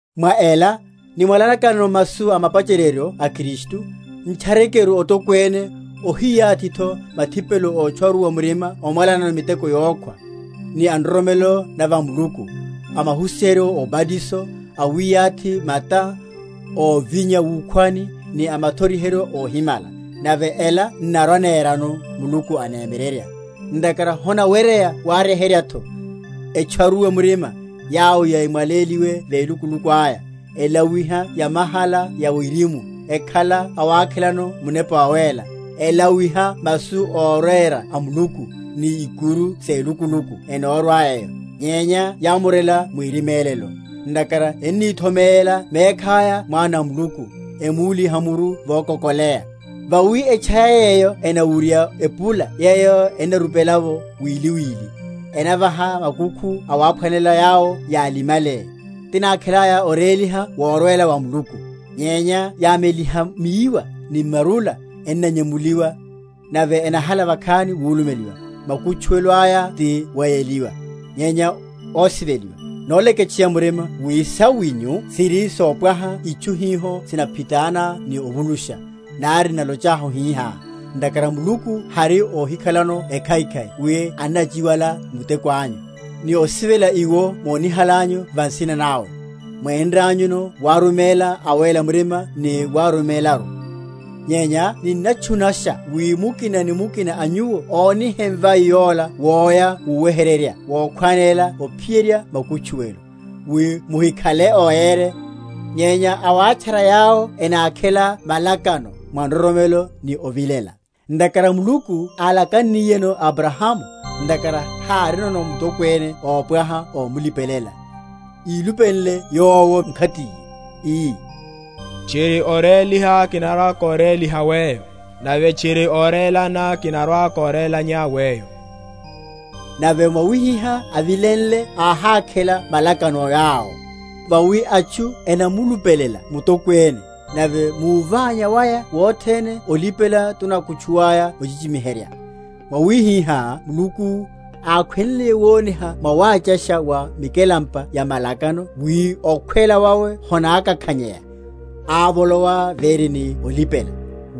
Mwa ela, nimwalanakano masu a mapacheryeryo a Kristu, n’tcharekeru otokwene, óhiyathitho mathipelo ótcharuwa murima omwalanano miteko yokhwa, ni a nroromelo na va Muluku, a mahusiheryo óbatiso, a wiyathi mata, óvinya wukhwani, ni a mathoriheryo óhimala. Nave ela n’narwa‐nerano, Muluku anemyererya. Ntakhara honaweryeya waryeheryatho, etcharuwe m’murima, yawo yámwaléliwe velukuluku aya, elawiha yamahala ya wirimu, ekhala awakhelano Munepa Wawéla, elawiha masu órera a Muluku, ni ikuru selukuluku enorwa eyo, nyenya yamorela mwirimélelo; ntakhara enníthomeyela mekhaya Mwana a Muluku, emúliha muru vokokoleya. Vawi etchaya yeyo enawurya epula yeyo enarupela’vo wili wili, ennavaha makukhu awaphwanelela yawo yálimme, tinákhelaya oréliha worwela wa Muluku: nyenya yameliha miwa ni marula, ennanyemuliwa; nave enahala vakhani wulumeliwa; makutchuwelo aya ti weyeliwa. Nyenya, ósiveliwa, noleketcheya murima wi sawinyu siri sopwaha itchu hiho sinaphitana ni ovulusha, nari n’nalochahu hihá; ntakhara Muluku hari óhikhalano ekhaikhai wi anachiwala muteko anyu, ni osivela iwo mónihalanyu va nsina nawe, mwénranyuno waruméla awéla murima ni warumélaru. Nyenya ninnatchunasha wi mukina ni mukina a nyuwo ónihe mvai yola woya wuweheryerya wokhwánela ophiyerya makutchuwelo; wi muhikhale óyere, nyenya awátchara yawo enákhela malakano mwa nroromelo ni ovilela. Ntakhara Muluku álakanniyeno Abrahamu, ntakhara hárinono mutokwene ópwaha ómulipelela, ílupenle Yowo mkhatiye, ii, Tchiri oréliha kinarwa‐kóréliha weyo, nave tchiri orelana kinarwa‐kórelanya weyo. Nave mwawihihá avilenle áhákhela malakano yawo. Vawi atchu enamulupelela mutokwene; nave muványa waya wothene olipela tunakutchula ochichimiherya. Mwawihihá Muluku, ákhwenliye woniha mwawachasha wa mikelampa ya malakano wi okhwela wawe honákakhanyeya, ávolowa véri ni olipela;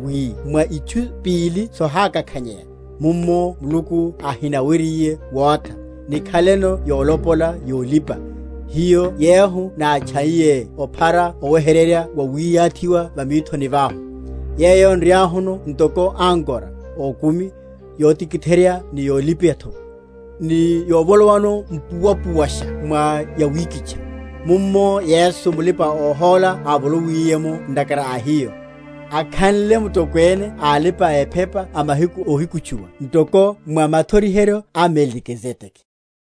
wi mwa itchu pili sohákakhanyeya, mummo Muluku ahinaweryiye wotha, nikhaleno yonlopola yolipa, hiyo yehu nátchaiye ophara oweheryerya wawiyathiwa va mithoni vahu; yeyo nriahuno ntoko ankora ókumi, yotikitheryeya ni yolipatho, ni yovolowa mpuwapu?-?washa mwa yawikitcha; mummo Yesu mulipa‐ohóla ávolowiliye’mo ntakhara a hiyo, akhanle Mutokwene a alipa‐ephepa a mahiku óhikutchuwa ntoko mwa mathoriheryo a Melikizedeke.